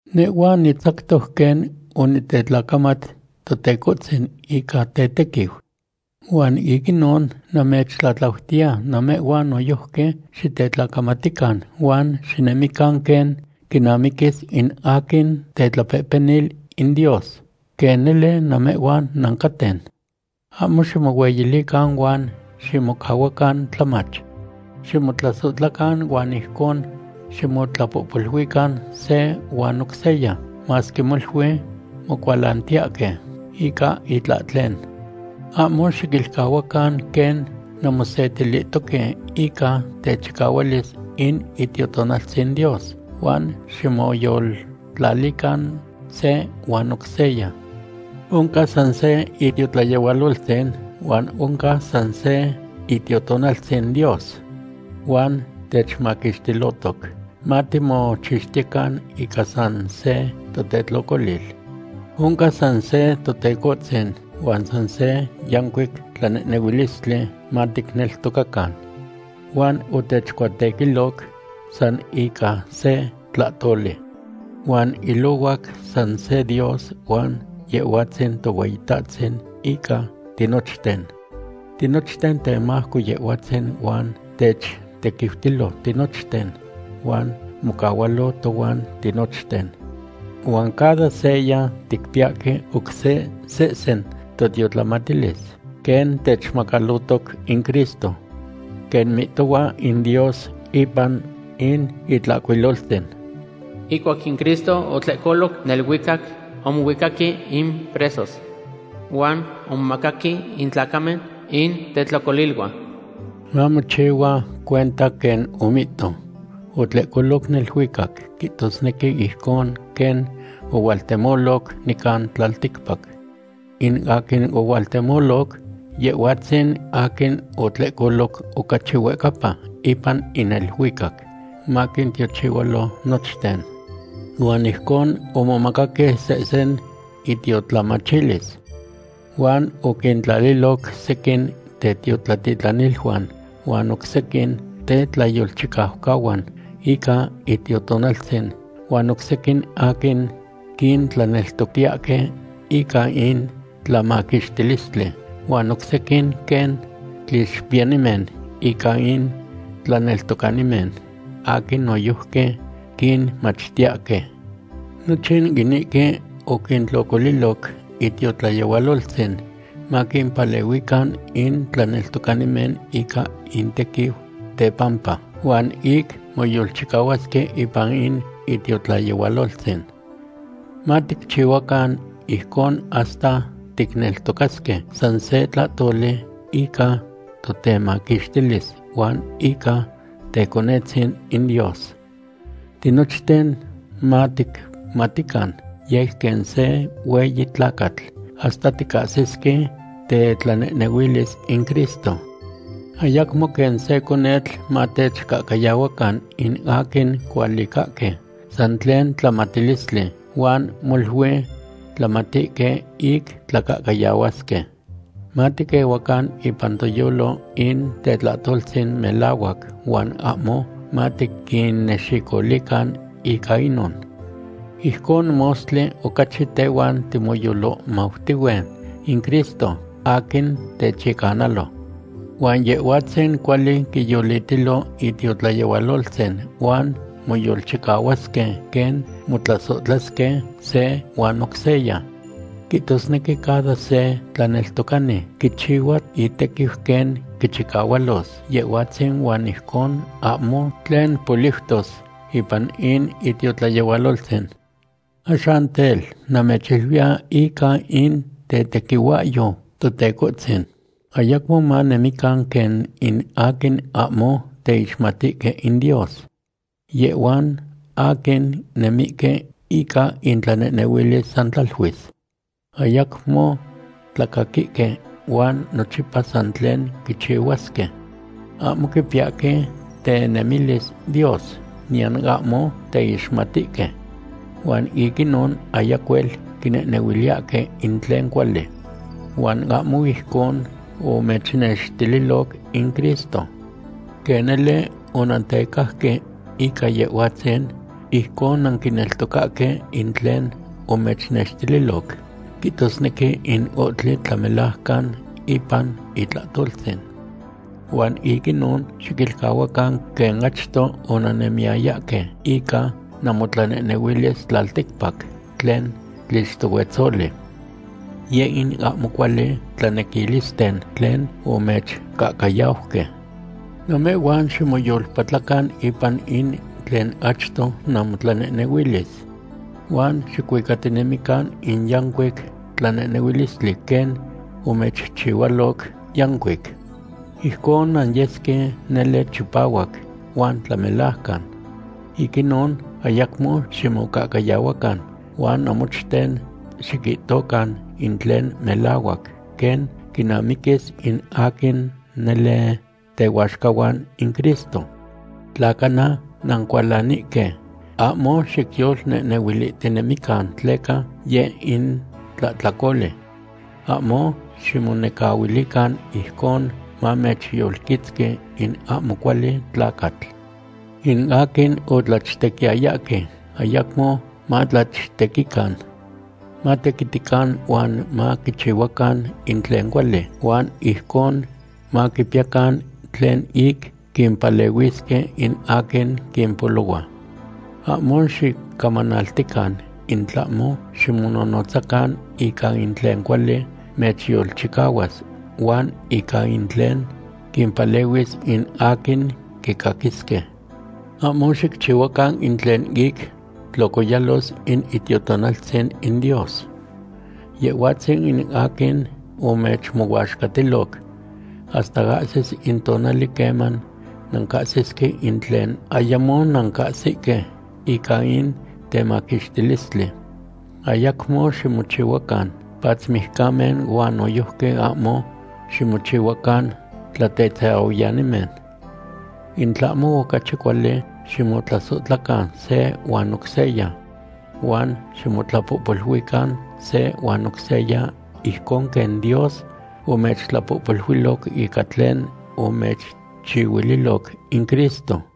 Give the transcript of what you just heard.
Nehhua nitzactoc quen onitetlacamat Totecohtzin ica tetequiu. Huan ic inon namechtlatlautiya namehhuan noyojqui xitetlacamatican huan xinemican quen quinamiquis in aquin tetlapehpenil in Dios, quen nele namehhuan nancaten. Ahmo ximohueyilican huan ximocahuacan tlamach. Ximotlasohtlacan huan ijcon ximotlapohpoluican se huan oc seya, masque molui mocualantiyahque ica itlahtlen. Ahmo xiquilcahuacan quen nanmosetilihtoque ica techicahualis in Itiotonaltzin Dios, huan ximoyoltlalican se huan oc seya. Oncan san se itiotlayehualoltzin, huan oncan san se Itiotonaltzin Dios. Huan techmaquixtilotoc matimochixtiyecan ica san se totetlocolil. Oncan san se Totecohtzin huan san se yancuic tlanehnehuilistli maticneltocacan. Huan otechcuatequiloc san ica se tlahtoli. Huan ilohuac san se Dios huan Yehhuatzin Tohueyitahtzin ica tinochten. Tinochten temajco Yehhuatzin huan techtequiutilo tinochten huan mocahualo tohuan tinochten. Huan cada seya ticpiyahque oc se sehsen totiotlamatilis, quen techmacalotoc in Cristo. Quen mihtohua in Dios ipan in Itlahcuiloltzin: Ihcuac in Cristo otlehcoloc neluicac, omohuicaqui in presos. Huan omomacaqui in tlacamen in tetlocoliluan. Mamochi cuenta quen omihto: “Otlehcoloc neluicac.” Quihtosnequi ijcon quen ohualtemoloc nican tlalticpac. In aquin ohualtemoloc, Yehhuatzin aquin otlehcoloc ocachi huehcapa ipan in neluicac, maquintiochihualo nochten. Huan ijcon omomacaqui sehsen intiotlamatilis. Huan oquintlaliloc sequin tetiotlatitlaniluan, huan oc sequin tetlayolchicaucahuan ica Itiotonaltzin, huan oc sequin aquin quintlaneltoctiyahque ica in tlamaquixtilistli, huan oc sequin quen tlixpiyanimen ica in tlaneltocanimen aquin noyojqui quinmachtiyahque. Nochin inihque oquintlocoliloc itiotlayehualoltzin maquimpalehuican in tlaneltocanimen ica intequiu tepampa, huan ic moyolchicahuasque ipan in itiotlayehualoltzin. Maticchihuacan ijcon hasta ticneltocasque san se tlahtoli ica totemaquixtilis huan ica Teconetzin in Dios. Tinochten maticmatican yec quen se hueyi tlacatl, hasta ticahsisque tetlanehnehuilis in Cristo. Ayacmo quen se conetl matechcahcayahuacan in aquin cualicahque san tlen tlamatilistli, huan molui tlamatihque ic tlacahcayahuasque. Matiquehuacan ipan toyolo in tetlahtoltzin melahuac huan ahmo matiquinnexicolican ica inon. Ijcon mostli ocachi tehuan timoyolohmautihue in Cristo, aquin techyecanalo. Huan Yehhuatzin cuali quiyolitilo itiotlayehualoltzin huan moyolchicahuasque quen motlasohtlasque se huan oc seya. Quihtosnequi cada se tlaneltocani quichihua itequiu quen quichicahualos Yehhuatzin huan ijcon ahmo tlen poliutos ipan in itiotlayehualoltzin. Axan tel, namechiluiya ica in tetequihuahyo Totecohtzin, ayacmo manemican quen in aquin ahmo teixmatihque in Dios. Yehhuan aquin nemihque ica intlanehnehuilis san tlaluis. Ayacmo tlacaquihque huan nochipa san tlen quichihuasque. Ahmo quipiyahque tenemilis Dios, niyan ahmo teixmatihque. Huan ic inon ayacuel quinehnehuiliyahque in tlen cuali. Huan ahmo ijcon omechnextililoc in Cristo. Quen nele onantecajque ica Yehhuatzin, ijcon nanquineltocahque in tlen omechnextililoc, quihtosnequi in ohtli tlamelajcan ipan itlahtoltzin. Huan ic inon xiquilcahuacan quen achto onannemiyayahque ica namotlanehnehuilis tlalticpac tlen tlixtohuetzoli. Yeh in ahmo cuali tlanequilisten tlen omechcahcayauque. Namehhuan ximoyolpatlacan ipan in tlen achto namotlanehnehuilis. Huan xicuicatinemican in yancuic tlanehnehuilistli quen omechchihualoc yancuic. Ijcon nanyesque nele chipahuac huan tlamelajcan. Ic inon, ayacmo ximocahcayahuacan huan namochten xiquihtocan in tlen melahuac quen quinamiquis in aquin nele tehuaxcahuan in Cristo. Tla cana nancualanihque, ahmo xicyolnehnehuilihtinemican tleca yeh in tlahtlacoli. Ahmo xicmonecahuilican ijcon mamechyolquitzqui in ahmo cuali tlacatl. In aquin otlachtequiyayahque ayacmo matlachtequican. Matequitican huan maquichihuacan in tlen cuali, huan ijcon maquipiyacan tlen ic quimpalehuisque in aquin quipolohua. Ahmo xicamanaltican, in tlahmo ximonohnotzacan ica in tlen cuali mechyolchicahuas huan ica in tlen quimpalehuis in aquin quicaquisque. Ahmo xicchihuacan in tlen ic tlocoyalos in Itiotonaltzin in Dios. Yehhuatzin in aquin omechmohuaxcatiloc hasta ahsis in tonali queman nancahsisque in tlen ayamo nancahsihque ica in temaquixtilistli. Ayacmo ximochihuacan patzmijcamen huan noyojqui ahmo ximochihuacan tlatetzahuiyanimen. In tlahmo ocachi cuali, ximotlasohtlacan se huan oc seya. Huan ximotlapohpoluican se huan oc seya ijcon quen Dios omechtlapohpoluiloc ica tlen omechchihuililoc in Cristo.